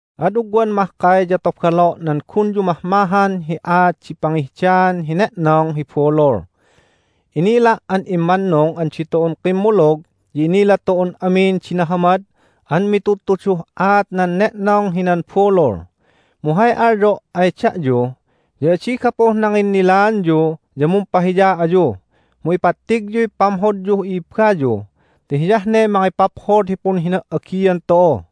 Ad ugwan mahkay ya tobalo' nan gunyu mahmahan hi aat di pangihdaan hi ne'nong hi bulul. Inila' an immannung an ditu'un kimmulug ya inila tu'un amin di nahamad an mitudtuduh aat nan ne'nong hinan bulul. Mu hay alyo' ay da'yu ya adi gapuh nanginnilaanyu ya mumpahiya ayu mu ipattigyuy pamhodyuh i'ibbayu ti hiyah ne mangipaphod hi punhina"agian tu'u.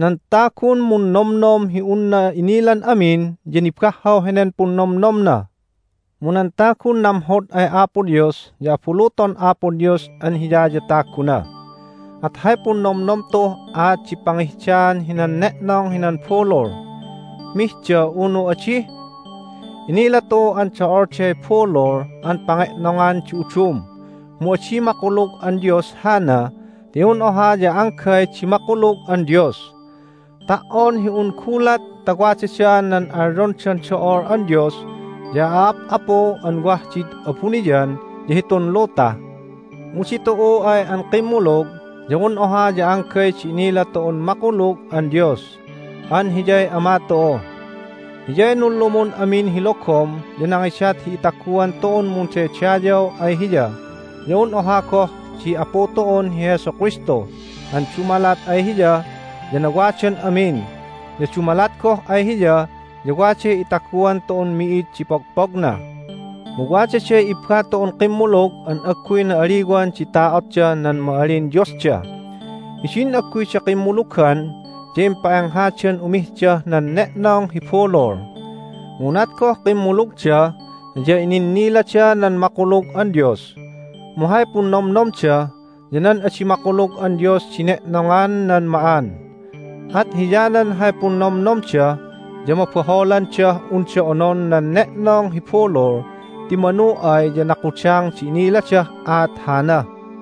Nan tagun munnomnom hi unna inilan amin ya nibahhaw henen punnomnomna. Mu nan tagun namhod ay Apo Dios ya abuluton Apo Dios an hiya ya taguna. At hay punnomnom tu'uh aat di pangihdaan hinan ne'nong hinan bulul---mihda, unu adi? Inila tu'u an do'olday bulul an pange'nongan di udum, mu adi makulug an dios hana ti un oha ya anggay di makulug an Dios. Ta"on hi un gulat ta wadada nan alyondan do'ol an dios ya a'ap'apu an wah did abuniyan ya hitun luta mu ditu'u ay an kimmulug ya un oha ya anggay di inila tu'un makulug an Dios an Hiyay Ama tu'u. Hiyay nunlumun amin hi logom ya nangidat hi itaguan tu'un mundaydayaw ay Hiya ya un oha goh di Apu tu'un hi Jesu Kristu an dumalat ay Hiya ya nawadan amin, ya dumalat goh ay Hiya ya waday itaguan tu'un mi'id di pogpogna. Mu wadaday ibba tu'un kimmulug an agguy na'aliwan di ta'otdah nan ma'alin diosda. Hidin agguyda kimmulugan ya impa'enghadan umihdah nan ne'nong hi bulul. Mu unat goh kimmulugda ya ininnilada nan makulug an Dios, mu hay punnomnomda ya nan adi makulug an dios di ne'nongan nan ma'an. At hiyanan hay punnomnomda ya mabaholandah unda onon nan ne'nong hi bulul ti manu ay ya nakudang di iniladah aat hana!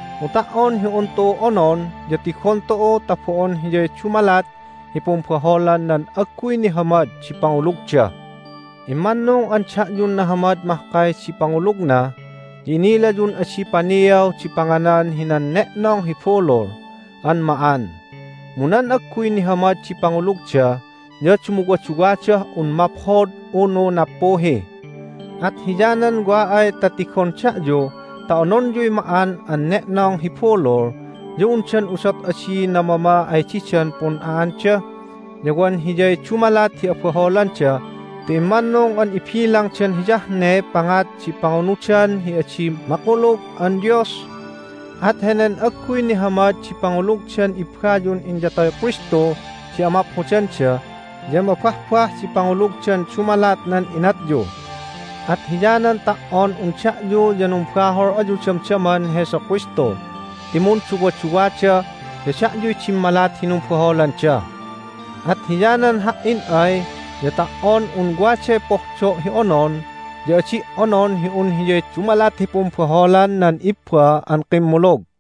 Mu ta"on hi un tu'u onon ya tigon tu'u ta bo'on hiyay dumalat hi pumbaholan nan agguy nihamad di pangulugda. Immannung an da'yun nahamad mahkay di pangulugna ya inilayun adi paniaw di panganan hinan ne'nong hi bulul an ma'an. Mu nan agguy nihamad di pangulugda ya dumuwaduwadah un maphod unu nappuhi. At hiyanan wa ay ta tigon da'yu ta ononyuy ma'an an ne'nong hi bulul ya undan udot adi namama ay didan pun'a'anda, ya wan hiyay dumalat hi abaholanda ti immannung an ibilangdan hiyah ne pangat di pangunudan hi adi makulug an dios? At henen agguy nihamad di pangulugdan ibbayun inyatoy Kristu di amaphodanda ya mabahbah di pangulugdan dumalat nan inatyu! At hiyanan ta"on un da'yu ya numbahol ayu damdaman Jesu Kristu ti munduwaduwada ya da'yuy dimmalat hi numbaholanda. At hiyanan ha"in ay ya ta"on un waday pohdo' hi onon ya adi' onon hi un hiyay dumalat hi pumbaholan nan ibba an kimmulug.